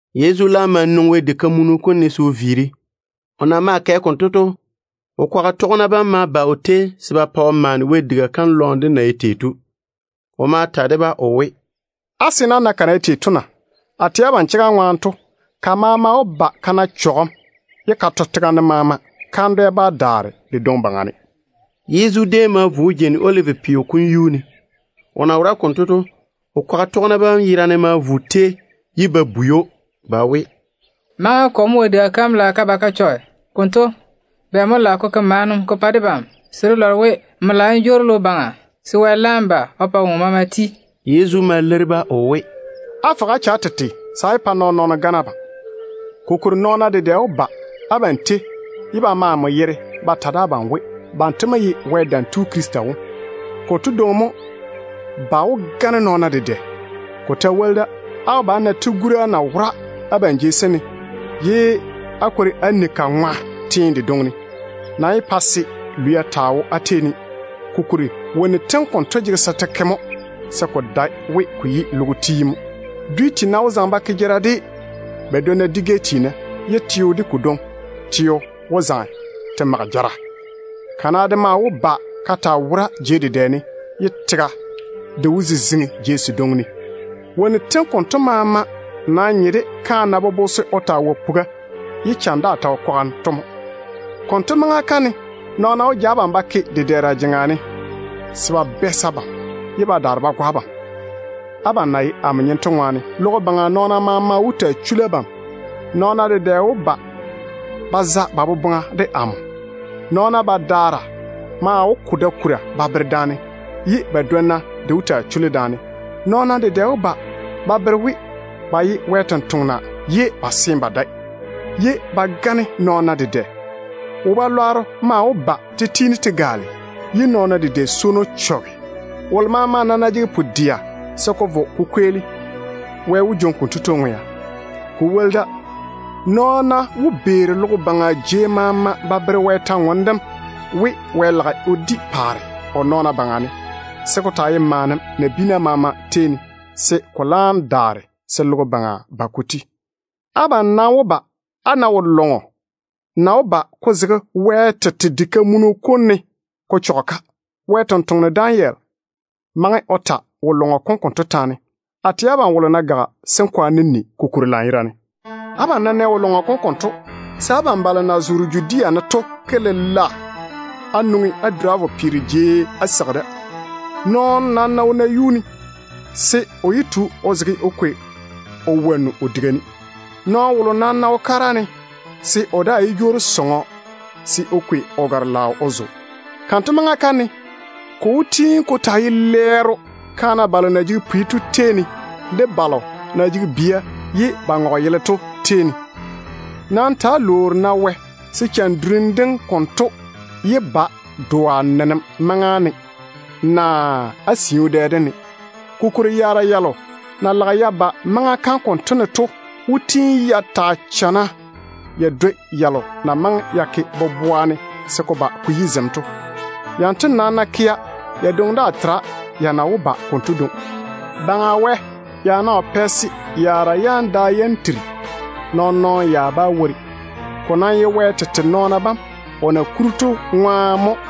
Yezu laam ma nwoŋi Wɛ diga kam ne se o viiri. O na maa kɛ konto to, o kwaga tɔgena bam ma ba o tei se ba pa o maane Wɛ diga kam lɔɔm dem na ye tei to. O ma ta de-ba o we, “Á nɛ ka na ye tei to na? A tɛ abam chega ŋwaane to, ka maama wó ba ka to ka saare tega ne. Kandwɛ dedwe daa bá daare de dwoŋi baŋa ne.” Yezu déem ma vo o jeini Olivi peo kom yuu ne. O na wora konto to, o kwaga tɔgena bam yerane ma vo o tei, ye ba bwei‑o ba we, “Maŋa kɔ mo Wɛ diga kam lage ka ba ka chɔge konto? Bɛ mo lage ko pa debam maana se dé lɔre we maŋa kam yi se n jwoori n ba logo baŋa, se ko maama laam ba ko kweeli?” Yezu ma leiri-ba o we, “Fɔge-na á che á tete se á yé pa nɔɔn-nɔɔno chwoŋa se o gane abam. Kokuri nɔɔna dedɛ wó ba abam tei ye ba ma amo yere ba ta de abam we, banto mo ye Wɛ Dam Tu Krista wom. Konto dwoŋi mo ba wó gane nɔɔna dedɛ. Ko ta woli da, á wó ba á na tigura na wora abam jei sem ne, ye á kwori á ni ka ŋwa teene dedwonna ne. Nam yé pa-na se lwia taa jege abam, kokuri wonnu tem konto jege se te ke mo, ye ko dae we ko yi logo kom tiim mo. Dwi tiina wó zaŋe ba ke jara de ba dwonna dwi-gɛ tiina, ye teo de ko dwoŋi teo wó zaŋe te mage jara. Kana de maa wó ba ka taa wora jei dedɛ ne, ye tega de wó ziziŋi jei sedwonna ne. Wonnu tem konto maama nam nye de kaane na virigi puga, ye cham daa ta wo kwaga ne to mo. Konto maŋa kam ne nɔɔna wó ja abam ba ke dedɛɛra jeŋa ne se ba bɛɛse abam, ye ba daare ba go abam. Abam na ye amo nyem to ŋwaane, logo baŋa nɔɔna maama wó taa chuli abam. Nɔɔna dedɛ wó ba ba za ba boboŋa de amo. Nɔɔna badaara maa wó ko da-kura ba bere daane, ye ba badwonna de wó taa chuli daane. Nɔɔna dedɛ wó ba ba bere we ba ye Wɛ sampwori ye ba seene ba dae. Ba maa wó gane nɔɔna dedɛ. Totoŋ-lwanno maa wó ba te tiini te gaale, ye nɔɔna dedɛ swono de chɔge. Wolo maama nam ná jege pu-dɛa se ko vo ko kweeli, Wɛ wó jwoŋi konto tu ŋwea. Ko woli da, nɔɔna wó beeri logo baŋa jei maama ba tɔɔle Wɛ kwor-ywoŋa kam we, Wɛ lage o di paare o nɔɔna baŋa ne, se ko taa ye maana nabiina maama tei ne, se logo kom kweelim laam yi. Abam nam wó ba á na wo-zɔɔne delo na chɔge Wɛ yere to na wó ba ko zege Wɛ tete diga kam ne. Wɛ sampwora Danyeli maŋe o ta wo-zɔɔne dem konto taane.” A tɛ abam wolo ná gaga, se n kwaane n ni ko kuri lanyerane. “Abam ná nɛ wo-lɔŋɔ kom konto, se abam balo na zoore Judea ne to ke lela á nwoŋi á duri á vo peero jei á seigi da. Nɔɔno nam ná wo nayuu ne, se o yé tu o zege se o kwaleme o wonnu o diga wone. Nɔɔno wolo nam ná wo kara ne, se o daa yé jwoori sɔŋɔ se o kwei o gare-laao o zo. Kanto maŋa kam ne ko wó tiini ko taa ye lɛɛro kaana balo na jege pwi to tei ne, de balo na jege bia ye ba ŋɔge yele to tei ne. Nam ta‑á lwoori-na Wɛ se cham durim dem konto yé ba doa nenem maŋa ne, naa á siu dɛ dem ne. Kokuri yaara yalo na lage ya ba maŋa kam konto ne to wó taa chamma ya dwoi yalo na maŋe ya ke boboa ne se ko ba ko yi zem to. Yanto nam ná kea, ya dwoŋi daa tera ya na wó ba konto dwoŋi. Wɛ ya ná wo pɛ se yaara yam da yam tiri, nɔɔn-nɔɔno ya bá wori. O nam wó pa se yaara yam da yam tiri, o tete nɔɔna bam o na kuri to ŋwaane.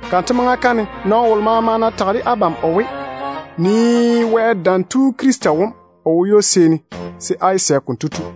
Kanto maŋa kam ne, nɔɔno wolo maama ná tage de abam o we, ‘Nii Wɛ Dam Tu Krista wom, o wo ywo-seeni’, se á yé sɛ konto tu.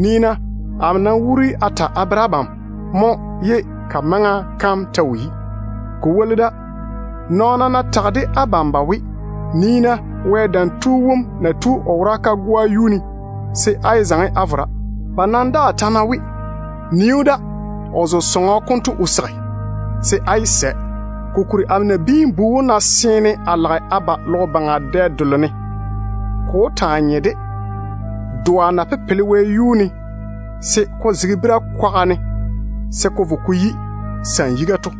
Nii-na, amo nam wuuri a ta a bere abam mo ye ka maŋa kam ta wo yi. Ko woli da, nɔɔna ná tage de abam ba we, ‘Nii-na Wɛ Dam Tu wom na tu o wora kagoa yuu ne’, se á yé zaŋe á vo dáane. Ba nam daa ta ná we, ‘Nii‑o da, o zo sɔŋɔ konto o seigi’, se á yé sɛ. Kokuri amo Nabiin-bu wom ná seene a lage a ba logo baŋa dɛ delo ne, ko wó taa nye de doa na pepele wɛyuu ne se ko zege bira-kwaga ne ko vo ko yi sam-yiga to.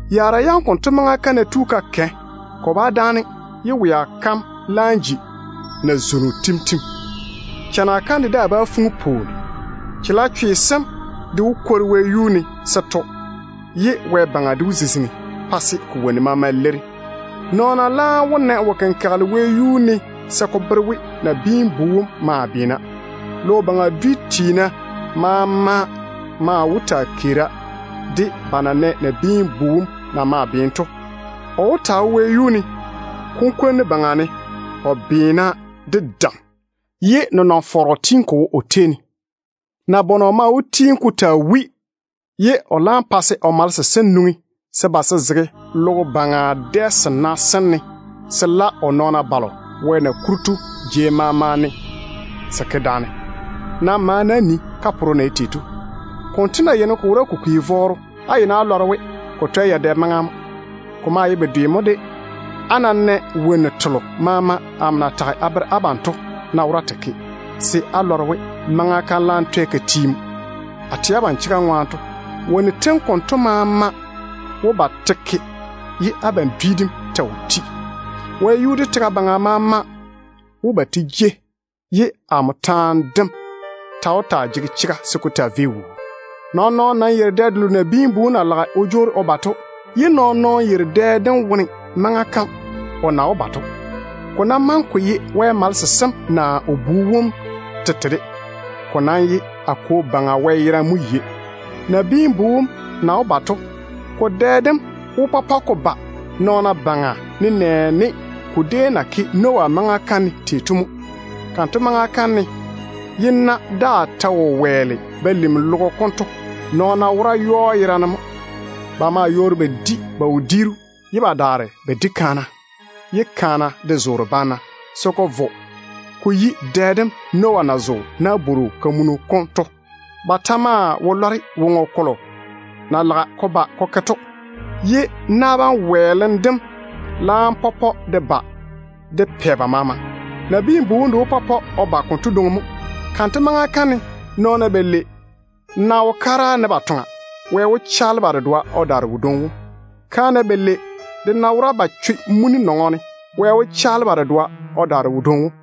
Yaara yam konto maŋa kam ná tu ka kɛ, ko bá dáane ye wea kam laam ji nazwono tim-tim. Chana kam de daa bá fuŋi se pwooni taa wora. Chalechwe sem de wó kwori wɛyuu ne se to tega ne, ye wɛ-baŋa de wó ziziŋi pa se ko wonnu maama leiri. Nɔɔna laam wó na wo-kenkagele wɛyuu ne se ko bere we Nabiin-bu wom maa beena. Logo baŋa dwi tiina maama maa wó taa keera, de ba na nɛ Nabiin-bu wom na maa beene to. O wó taa dɔge kunkwonnu baŋa ne o beena de dam, ye nenɔŋ-fɔrɔ tiini ko wo o tei ne. Nabɔnɔ maa wó tiini ko taa wui wɛ-wɛ, ye o laam pa se Wɛ malese sem nwoŋi se ba se zege logo baŋa dɛ sena sem ne, se se la nɔɔna balo Wɛ na kuri ye ba wo jei maama ne to se ke daane. Nam maane-na á nii kaporo na ye tei to. Konto ná yeini ko wora ko kwi vɔɔro, á yeini á lɔre we ko twɛ yadɛ maŋa mo. Ko maa ye bedwe mo de á ná nɛ wonnu tento maama ná wora te ke, se á lɔre we maŋa kam laam twɛ ka ti mo. A tɛ abam chega ŋwaane to, wonnu tem konto maama wó ba te ke ye abam dwi dem ta wo ti. Wɛyuu de tega baŋa maama wó ba te jei, ye amo taane dem ta wó taa jege chega se ko taa vei wuu. Nɔɔn-nɔɔno nam yeiri dɛ delo Nabiin-bu wom na lage o jwoori o ba to, ye nɔɔn-nɔɔno yeiri dɛ dem wone maŋa kam o na wó ba to, ko ná maŋe ko ye Wɛ malese sem naa o Bu wom tete de. Ko nam ye a Kwo Baŋa Wɛ yerane mo yei. Nabiin-bu wom na wó ba to, ko dɛ dem wó pɔpɔ de ba nɔɔna baŋa nenɛɛne ko déem na ke Noah maŋa kam ne tei to mo. Kanto maŋa kam ne ye na-fɔrɔ daa ta wo wɛɛle ko lim tega kam to, nɔɔna wora yɔɔ yerane mo. Ba maa yɔɔre ba di ba wodiiru, ye ba daare ba di kaana, ye kaana de zoore banna, se ko vo ko yi dɛ dem Noah na zo nabwor-kamunu kom wone to. Ba ta maa wo lɔre woŋo kolo na lage ko ba ko ke to, ye na bam wɛɛlem dem laam pɔpɔ de ba de pɛ ba maama. Nabiin-bu wom de wó pɔpɔ o ba konto dwoŋi mo. Kanto maŋa kam ne nɔɔna balei ná wo kara ne ba toŋa, Wɛ wó chaale ba dedoa o daare wodwoŋi wom. Kaana balei de ná wora ba choe muni nɔŋɔ ne, Wɛ wó chaale ba dedoa o daare wodwoŋi wom.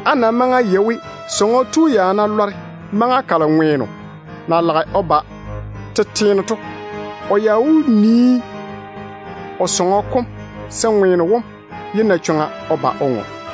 Á nam maŋe á yei we, sɔŋɔ tu ya ná lɔre maŋa kalo ŋweeno na lage o ba tete ne to, o ya wó taa nii o sɔŋɔ kom se ŋweeno wom yé na chwoŋa o ba o ŋɔ.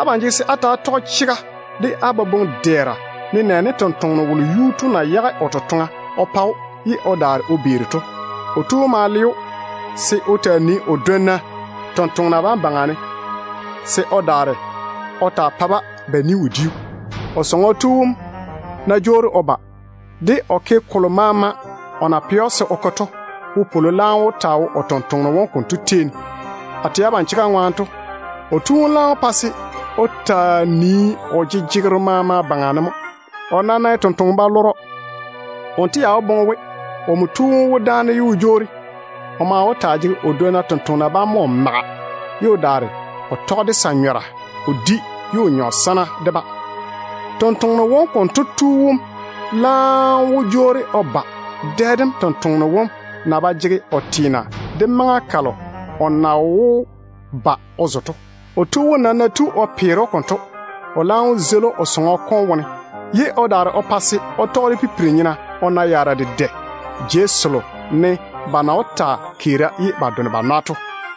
Abam jege se á ta‑á tɔge chega de á boboŋ-dɛɛra, nenɛɛne tontoŋeno wolo yuu tu na yage o totoŋa o pa‑o ye o daare o beeri to. O tu wom ma le‑o se o taa nii o dwonna tontoŋena bam baŋa ne se o daare o taa pa-ba ba ni-wodiu. Kotu sɔŋɔ tu wom ná jwoori o ba, de o ke kolo maama o na pɛ‑o se o ke to, wopwolo laam wó taa wo tontoŋeno wom konto tei ne. A tɛ abam chega ŋwaane to, o tu wom laam wó pa se o taa nii o jejegero maama baŋa ne mo. O nam ná ye tontoŋeno-balɔrɔ, wonto ya wó boŋe we omo tu wom wó dáane ye o jwoori. O maa wó taa jege o dwonna tontoŋena bam mo o maga, ye o daare o tɔge de sa-nyɔra o di ye o nyɔ sana de-ba. Sɔŋɔ tu wom laam wó jwoori o ba dɛ dem tontoŋeno wom na ba jege o teena de maŋa kalo o na wó ba o zo to. O tu wom nam ná tu o peere‑o konto, o laam wó zeili‑o o sɔŋɔ kom wone, ye o daare o pa se o tɔge de pipiri-nyena o na yaara dedɛ jei selo ne ba na wó taa keera ye ba done ba nwa to.